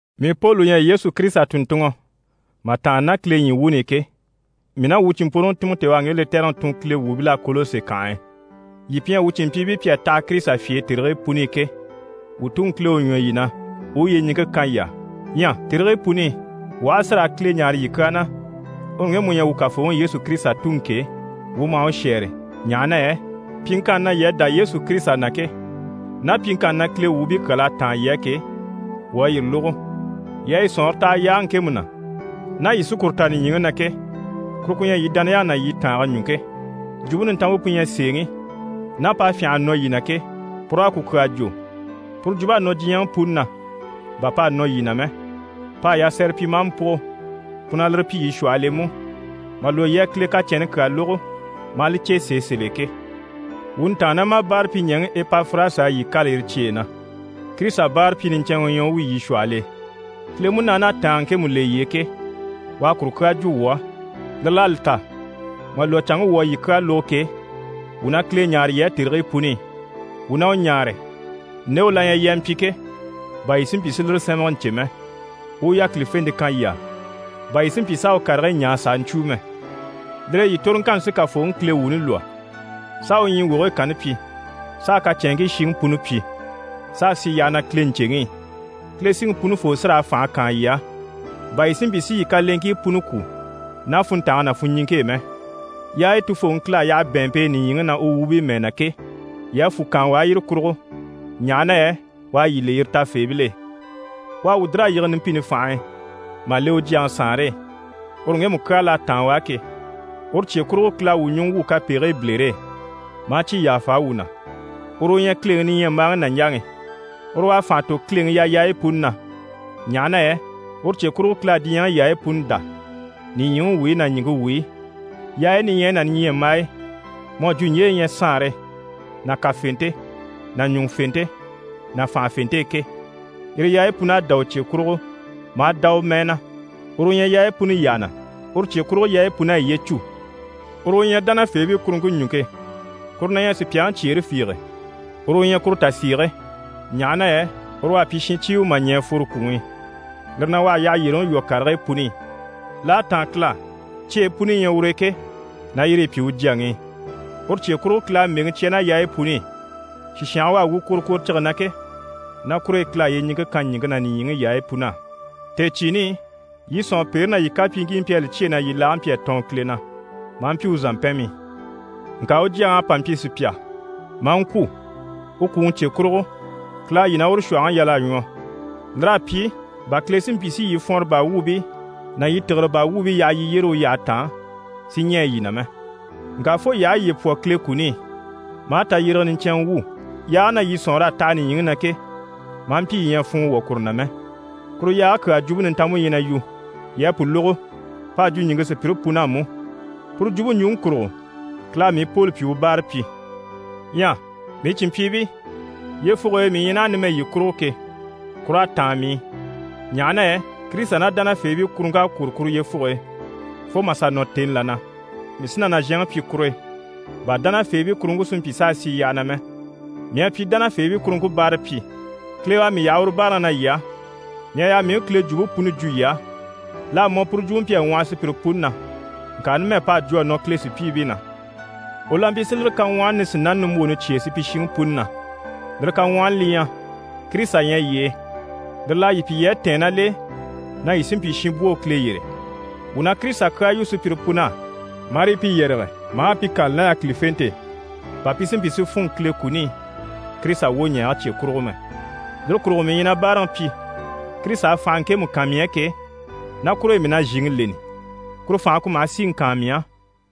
Mii Poli u ɲyɛ Yesu Kirisita tùnntunŋɔ mà tàanna ná Kile ɲyii wuuni i ke, mii ná wuu cìnmpworoŋi Timɔti, u à ŋge lɛtɛrɛŋi tun Kile wuubil'á Kɔlɔsi kànhe e. Yii pi ɲyɛ wuu cìnmpyiibii pi à taha Kirisita fye e tèrigii puni i ke, wuu Tuŋi Kile u ɲwɔ yii na, u u yyeɲiŋke kan yii á. Ɲyɛ tèrigii puni i wuu aha a si raa Kile ɲáare yii kyaa na, uru ŋgemu u ɲyɛ wuu Kafooŋi Yesu Kirisita Tuŋi ke, wuu maha u shɛ́ɛre, ɲaha na yɛ pyiŋkanni na yii à dá Yesu Kirisita na ke, ná pyiŋkanni na Kile wuubii puni kyal'à táan yii á ke, wuu à yire lógo. Yii à yii sɔ̀nŋɔre taha yaage ŋkemu na, ná yii sí kuru ta nìɲyiŋi na ke, kuru ku ɲyɛ yii dániyaŋi ná yii tàange ɲùŋke. Jwumpe Nintanmpe pu ɲyɛ sèeŋi, ná p'à fyânha a nɔ yii na ke, pur'à ku kyaa jwo. Puru jwump'à nɔ diɲyɛŋi puni na bà p'à nɔ yii na mɛ, p'à yasɛrɛ pyi, maa mpúgo. Pu na lire pyi yii shwɔhɔl'e mú, mà lwɔ́ yii à Kile kacɛnni kyaa lógo, maa li cè sèe sèl'e ke. Wuu ntàannamabaarapyiɲɛɛŋi Epafirasi à yii kâla yire cyeyi na. Kirisita báarapyi niɲcɛnŋɛ u ɲyɛ u wi yii shwɔhɔl'e. Kile Munaani à tàange ŋkemu le yii e ke, u à kuru kyaa jwo wuu á. Lire l'à li ta, mà lwɔ́ canŋke wuu à yii kyaa lógo ke, wuu na Kile ɲáare yii á tèrigii puni i. Wuu na u ɲáare, nde u la ɲyɛ yii a mpyi ke, bà yii si mpyi si lire sɛ́nmɛgɛ ɲcè mɛ. U u yákilifente kan yii á, bà yii si mpyi s'a u karigii ɲaa s'a ɲcwúu mɛ. Lire e yii toroŋkanni sí Kafooŋi Kile wuuni lwɔ́, s'a u ɲyii wogigii kanni pyi, s'a kacɛnŋkii shiŋi puni pyi, s'a sì yyaha na Kile ɲcèŋi i. Kile Siŋi Punifoo sí raa fànhe kaan yii á, bà yii si mpyi si yii kaleŋkii puni kwú ná funntange ná funɲiŋke e mɛ. Yaayi Tufooŋi Kile à yaha u bɛ̀ɛnmpe e nìɲyiŋi na, u wuubii mɛɛ na ke, yii a fwù kaan u á yire kurugo, ɲaha na yɛ u à yii le yire tafeebil'e. U à wuu dìr'a yige numpini fànhe e mà le u Jyaŋi saanre e, uru ŋgemu kyaa l'à táan u á ke. Uru cye kurugo Kile à wuu ɲùŋɔ wwû kapegigii bilere e, maa cyi yàfa wuu na. Uru u ɲyɛ Kileŋi niɲyambaaŋi nàɲjaŋi, uru u à fànha tò Kileŋi yayaayi puni na, ɲaha na yɛ uru cye kurugo Kile à diɲyɛŋi yaayi puni dá, nìɲyiŋi wuyi ná ɲìŋke wuyi, yaayi niɲyayi ná niɲyambaayi, mu à jwo ɲje yi ɲyɛ saanre ná kafente ná ɲùŋufente ná fànhafente e ke, yire yaayi pun'à dá u cye kurugo, maa dá u mɛɛ na. Uru u ɲyɛ yaayi puni yyaha na, uru cye kurugo yaayi pun'à yiye cû. Uru u ɲyɛ dánafeebii kuruŋke ɲùŋke. Kuru na ɲyɛ sùpyaŋi cyeere fiige, uru u ɲyɛ kuru tasiige, ɲaha na yɛ uru u à pyi shincyiiwe mà ɲɛ̀ a fworo kwùŋi i. Lire na, u à yyahayyereŋi lwɔ́ karigii puni i. L'à táan Kile á, cyeyi puni yi ɲyɛ ur'e ke, na yire yi pyi u Jyaŋi i. Uru cye kurugo Kile à mbèŋi cya ná yaayi puni i. Sìshange u à wu kworokworocige na ke, ná kur'e Kile à yyeɲiŋke kan ɲìŋke ná nìɲyiŋi yaayi pun'á. Tèecyiini i, yii sɔ̀nŋɔpeere ná yii kapyiiŋkii mpyi a li cyêe na yii laage mpyi a tɔɔn Kile na, maa mpyi u zàmpɛnmii. Ŋka u Jyaŋi à pa mpyi sùpya maa ŋkwû. U kwùŋi cye kurugo, Kile à yii ná uru shwɔ̀hɔŋi yal'a ɲwɔ. Lir'à pyi bà Kile si mpyi si yii fwɔnrɔ baa wuubii ná yii tìgire baa wuubii yaha yii yyére u yyahe taan si ɲɛɛ yii na mɛ. Ŋka fo yii aha yiye pwɔ Kile kuni i, maa tayyérege niɲcɛnŋɛ wwû, yaage na yii sɔ̀nŋɔr'à taha nìɲyiŋi na ke, maa mpyi yii ɲyɛ a funŋɔ wwɔ̀ kuru na mɛ. Kuru yaage kyaa Jwumpe Nintanmpe ɲyɛ na yu. Yii à pu lógo, p'à jwo ɲìŋke sùpyire pun'á mú. Puru jwumpe ɲjwuŋi kurugo, Kile à mii Poli pyi u báarapyi. Ɲyɛ mii cìnmpyiibii, yyefuge e mii ɲyɛ naha numɛ yii kurugo ke, kur'à táan mii i, ɲaha na yɛ Kirisita ná dánafeebii kuruŋk'à kwôro kuru yyefuge e fo mà sà nɔ tèni là na, mii sí na nàzhanŋi pyi kur'e, bà dánafeebii kuruŋke si mpyi s'a sì yyaha na mɛ. Mii à pyi dánafeebii kuruŋke báarapyi, Kile u à mii yaha uru báaraŋi na yii á. Mii à yaa mii u Kile jwumpe puni jwo yii á. L'à mɔ, puru jwumpe mpyi a ŋwɔhɔ sùpyire puni na, ŋka numɛ p'à jwo a nɔ Kile sùpyiibii na. U la mpyi si lire kaŋwɔhɔni nisinani nimbwooni cyêe supyishiŋi puni na. Lire kaŋwɔhɔni li ɲyɛ: Kirisita ɲyɛ yii e, lire l'à yii pyi yii à tɛ̀ɛn ná l'e na yii sí n‑pyi shinbwoo Kile yyére. Wuu na Kirisita kyaa yu sùpyire pun'á, marii pi yɛrɛge maa pi kâlali ná yákilifente e, bà pi si mpyi si fûnŋɔ Kile kuni i, Kirisita wwoɲɛɛge cye kurugo mɛ. Lire kurugo mii ɲyɛ na báaraŋi pyi. Kirisita à fànhe ŋkemu kan mii á ke, ná kure e mii na zhìŋi leni. Kuru fànhe ku maha síŋi kaan mii á.